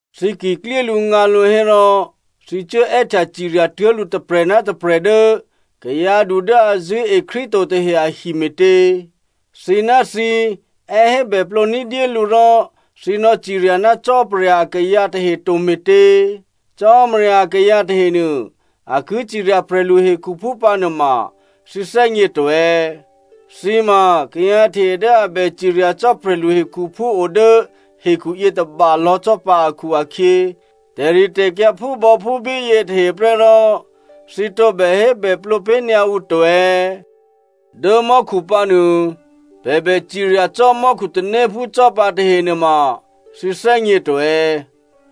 Thǐ ki klyélǔngǎlǔ hérò thǐ cuố è́htya cirya tuố̤ lǔ tôprè̤ ná tôprè̤ dố kayǎdu dố a zṳ̂́e Krístu to tahe ahi me̤tě? Thǐ ná thǐ è́ hébèplǒ ní̤dyé lǔ rò thǐ nò̌cirya ná Cò́marya akayǎ tahe to me̤tě? Cò́marya akayǎ tahenuô, a ki cirya prè̤lu hekhuphú pǎnuôma thǐ thè́gně to è̌? Thǐ ma kayǎ tahe dố a bè cirya cò́ prè̤lu hekhuphú o dố hekhu yětôba lò̌ cò́ pǎ akhu-akhyě, tè̤ritè̤kyǎ phúbò̌phúbí yětahe prè́ rò thǐ tǒbè hébèplǒ pé̤ nyǎ ǔ to è̌? Dố mò́khu pǎ nuô, pè̤ bè cirya cò́ mò́khu tanéphú cò́ pǎ tahe nuôma thǐ thè́gně to è̌?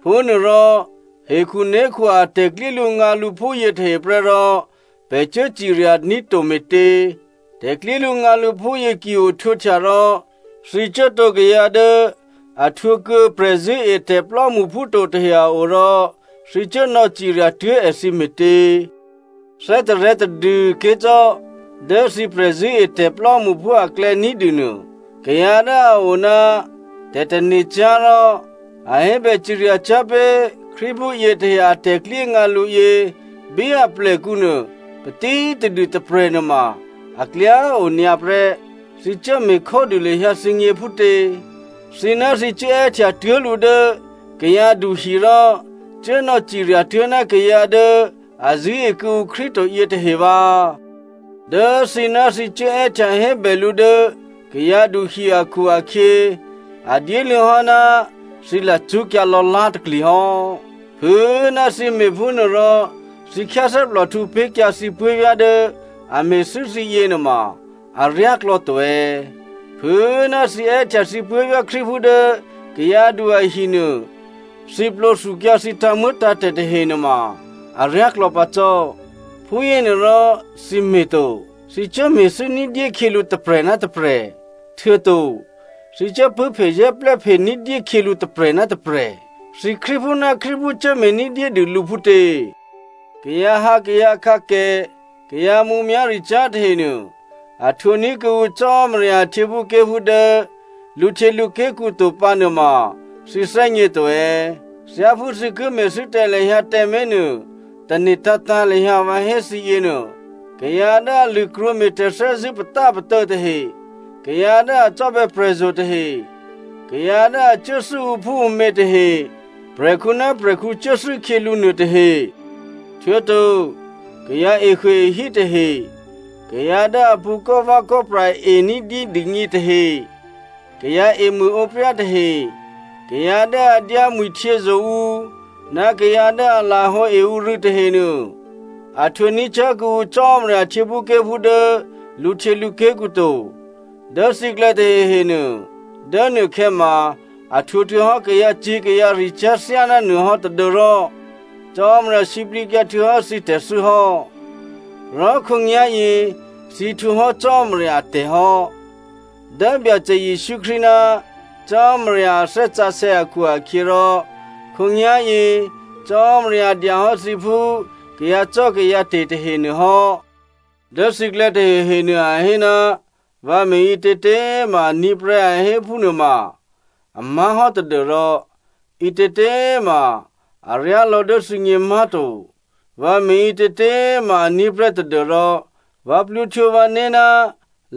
Phúnuôrò hekhuné̤khu a tè̤klyélǔngǎlǔ phúyě tahe prè́ rò pè̤ cuố ciryaní̤ to me̤tě? Tè̤klyélǔngǎlǔ phúyě ki ohtwǒhtya rò, thǐ cuố tǒ kayǎ dố a htwǒ kuô̌ prè̤zṳ̂́etè̤ plò́mṳphú to tahe a o rò thǐ cuố nò̌cirya tuố̤ èthǐ me̤tě? Thè́tarè̤̌ tadû꤮ ké̤ cò́. Dố thǐ prè̤zṳ̂́etè̤ plò́mṳphú aklè̌ ní̤dû nuô kayǎ dố a o ná tè̤tane̤cyá̤ rò a hébè ciryacyá̤ pé̤ Krístuphú yětahe a tè̤klyéngǎ lǔ yě bí aplèkǔ nuô patítadû tôprè̤ nuôma aklyá o nyǎ prè́. Thǐ cuố me̤ khódû lahyǎ thǐgně phútě. Thǐ ná thǐ cuố è́htya tuố̤ lǔ dố kayǎdu hi rò cuố nò̌cirya tuố̤ ná kayǎ dố a zṳ̂́e kuô̌ǔ Krístu to yětahe vǎ! Dố thǐ ná thǐ cuố è́htya hébè lǔ dố kayǎdu hi akhu-akhyě, a dyéluô̌ hò́ ná thǐ lacṳ́kyǎ lò̌lá̤takli hò́. Phû꤮ ná thǐ me̤phúnuô rò thǐ khyáthè́plòhtǔ pé̤kyǎ thǐ puố̤vyá̤ dố a me̤thû́ thǐ yěnuôma aryáklò̌ to è̌? Phû꤮ ná thǐ è́htya thǐ puố̤vyá̤ Krístuphú dố kayǎdu ahi nuô, thǐ plwǒ thukyǎ thǐ tǎ̤muô̌tǎ̤tè̤ tahe nuôma aryáklò̌ pǎ cò́. Phúyěnuôrò thǐ me̤ to. Thǐ cuố me̤thû́ ní̤dyé khyělǔ tôprè̤ ná tôprè̤. Htuô̌to thǐ cuố pṳ̂́phezè́plè́phe ní̤dyé khyělǔ tôprè̤ ná tôprè̤. Thǐ Krístuphú ná Krístuphú cuốme̤ ní̤dyédû lǔ phútě. Kayǎhǎ kayǎkǎkè, kayǎ mǔmyá̤ricyá̤ tahenuô a htwǒ ní̤ kuô̌ǔ Cò́marya a htyěphúké̤phú dố lǔhtyělǔké̤kǔ to pǎ nuôma thǐ thè́gně to è̌? Thyáphú thǐ ki me̤thû́ tǎ lahyǎ tǎmé̤ nuô, tane̤ tǎ̤tǎ̤ lahyǎ vǎ hé thǐ yěnuô. Kayǎ dố a lṳ̂krwǒme̤ tè̤thè́zṳ̂́ patápatô̌ tahe, kayǎ dố a cò́bè̌ prè̤zo̤ tahe, kayǎ dố a cuốthû́ ǔphúǔmě tahe, prè̤khǔ ná prè̤khǔ cuốthû́ khyělǔ nuôtahe, htuô̌to kayǎ ehuôehí tahe, kayǎ dố a pṳ̌ kò́vè̌kò́pra e ní̤dyé dûgně tahe, kayǎ emṳ̂ǒpryá tahe, kayǎ dố a dyámwi̤htyězo̤ ǔ, ná kayǎ dố a lahǒe ǔ rû̌ tahenuô a htwǒ ní̤ cyá̤ kuô̌ǔ Cò́marya a htyěphúké̤phú dố lǔhtyělǔké̤kǔ to. Dố thǐklè̌ tahehe nuô, dố nuôkhè̌ ma a htwǒ htuô̌hò́ kayǎcyě̤ kayǎricyá̤ thyáná nuôhò́ tadû́rò Cò́marya sǐplǐkyǎ htuô̌hò́ thǐ tè̤thû́ hò́. Rò khǒnyá̤yě thǐ htwǒ hò́ Cò́marya atè̤ hò́. Dố Byacè Jesǔ Krístu ná Cò́marya a Thè́ Sǎsè̌ akhu-akhyěrò khǒnyá̤yě, Cò́marya dyahò́ thǐ phú kayǎcò́kayǎte̤ tahenuô hò́. Dố thǐklè̌ tahehenuô, a hé, “Vǎ me̤ ǐtětě꤮ ma aní̤ prè́,” a hé phúnuô ma a má̤hò́ tadû́rò ǐtětě꤮ ma aryá lò̌ dố thǐgně má̤to. Vǎ me̤ ǐtětě꤮ ma aní̤ prè́ tadû́rò vǎ plwǒhtwǒ vǎné̤ ná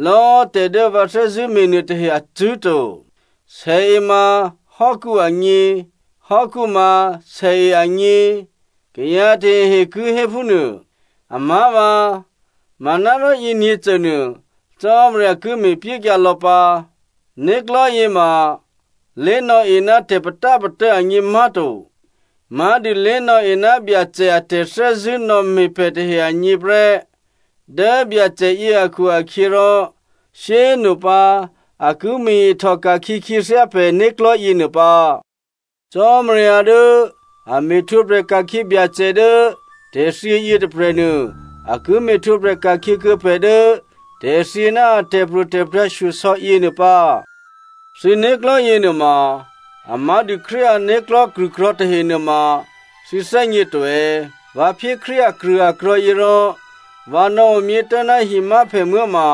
lò̌꤮ tè̤ dố vǎ thè́zṳ̂́ me̤ nuôtahe acṳ̂́ to. “Sèe ma hò́kǔ agně, hò́kǔ ma sèe agně,” kayǎ tahehe ki hé phúnuô. Amá̤vǎ, manárò yěnyě̤cônuô Cò́marya ki me̤pyékyǎ lò̌ pǎ. Né̤klò̤́ yěma lé̤nò̌e ná tè̤patápatô̌ agně má̤to. Má̤dû lé̤nò̌e ná Byacè a tè̤thè́zṳ̂́ nò̌me̤ pè̤ tahe agně prè́. Dố Byacè yě akhu-akhyěrò, shyé꤮ nopǎ a ki me̤ ihtòka̤khyě khyěthyá pè̤ né̤klò̤́ yěnuô pǎ. Cò́marya dố a me̤htwǒprè̤ ka̤khyě Byacè dố tè̤thyě yětôprè̤nuô, a ki me̤htwǒprè̤ ka̤khyě kuô̌ pè̤ dố tè̤thyě ná a tè̤pro̤tè̤prya̤ shyosò̌ yěnuô pǎ. Thǐ né̤klò̤́ yěnuôma a má̤dû Krístu ané̤klò̤́ krṳ̂krò̤̌ tahe nuôma thǐ thè́gně to è̌? Vǎ phyé Krístu akrṳ̂akrò̤̌ yě rò vǎ nò̌omyě tố̤ ná himyáphèmuố̤ ma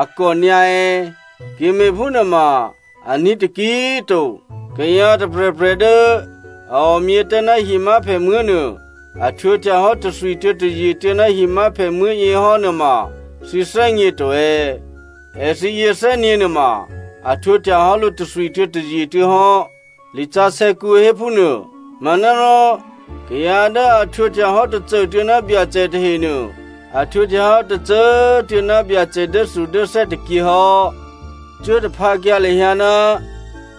a kò nyǎ è̌? Ki me̤phúnuôma aní̤ taki꤮ to. Kayǎ tôprè̤prè̤ dố a omyě tố̤ ná himyáphèmuố̤ nuô, a htwǒhtya hò́ tôthwituô̌ tôzyetuô̌ ná himyáphèmuố̤ yě hò́ nuôma thǐ thè́gně to è̌? “Èthǐ yě thè́nyě̤ nuôma a htwǒhtya hò́ lǔ tôthwituô̌ tôzyetuô̌ hò́” lisǎsè̌kǔ hé phúnuô. Manárò kayǎ dố a htwǒhtya hò́ tôcô꤮ tuô̌ ná Byacè tahenuô, a htwǒhtya hò́ tôcô꤮ tuô̌ ná Byacè dốthudốthè́ tôkyě hò́. Cuố taphǎkyǎ lahyǎ ná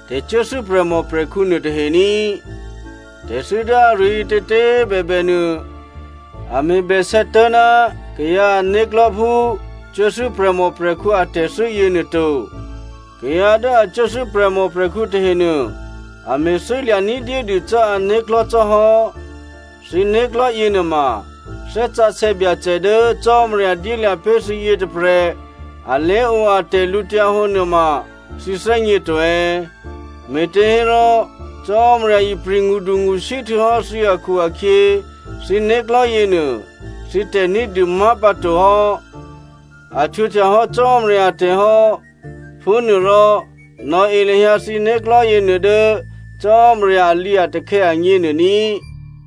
tè̤cuốthû́ prè̤mòprè̤khǔ nuôtahe ní꤮. Tè̤thû́ dố aruô ǐtětě꤮ bèbè nuô a me̤bè sè̌ tố̤ ná kayǎ ané̤klò̤́ phú cuốthû́ prè̤mòprè̤khǔ atè̤thû́ yěnuô to. Kayǎ dố a cuốthû́ prè̤mòprè̤khǔ tahenuô a me̤thû́ lya̤ ní̤dyédû cò́ ané̤klò̤́ cò́ hò́. Thǐ né̤klò̤́ yěnuôma Thè́ Sǎsè̌ Byacè dố Cò́marya dyélya̤ pé̤ thǐ yětôprè̤ alé̤o a tè̤lǔhǒdu nuôma thǐ thè́gně to è̌? Me̤těhérò Cò́marya ipri̤ ngṳdungṳsí htuô̌hò́ thǐ akhu-akhyě, thǐ né̤klò̤́ yěnuô thǐ tè̤ní̤dû má̤ pǎ to hò́. A htwǒhtya hò́ Cò́marya atè̤ hò́. Phúnuôrò nò̌e lahyǎ thǐ né̤klò̤́ yěnuô dố Cò́marya alǐatakhè̌ agněnuô ní꤮.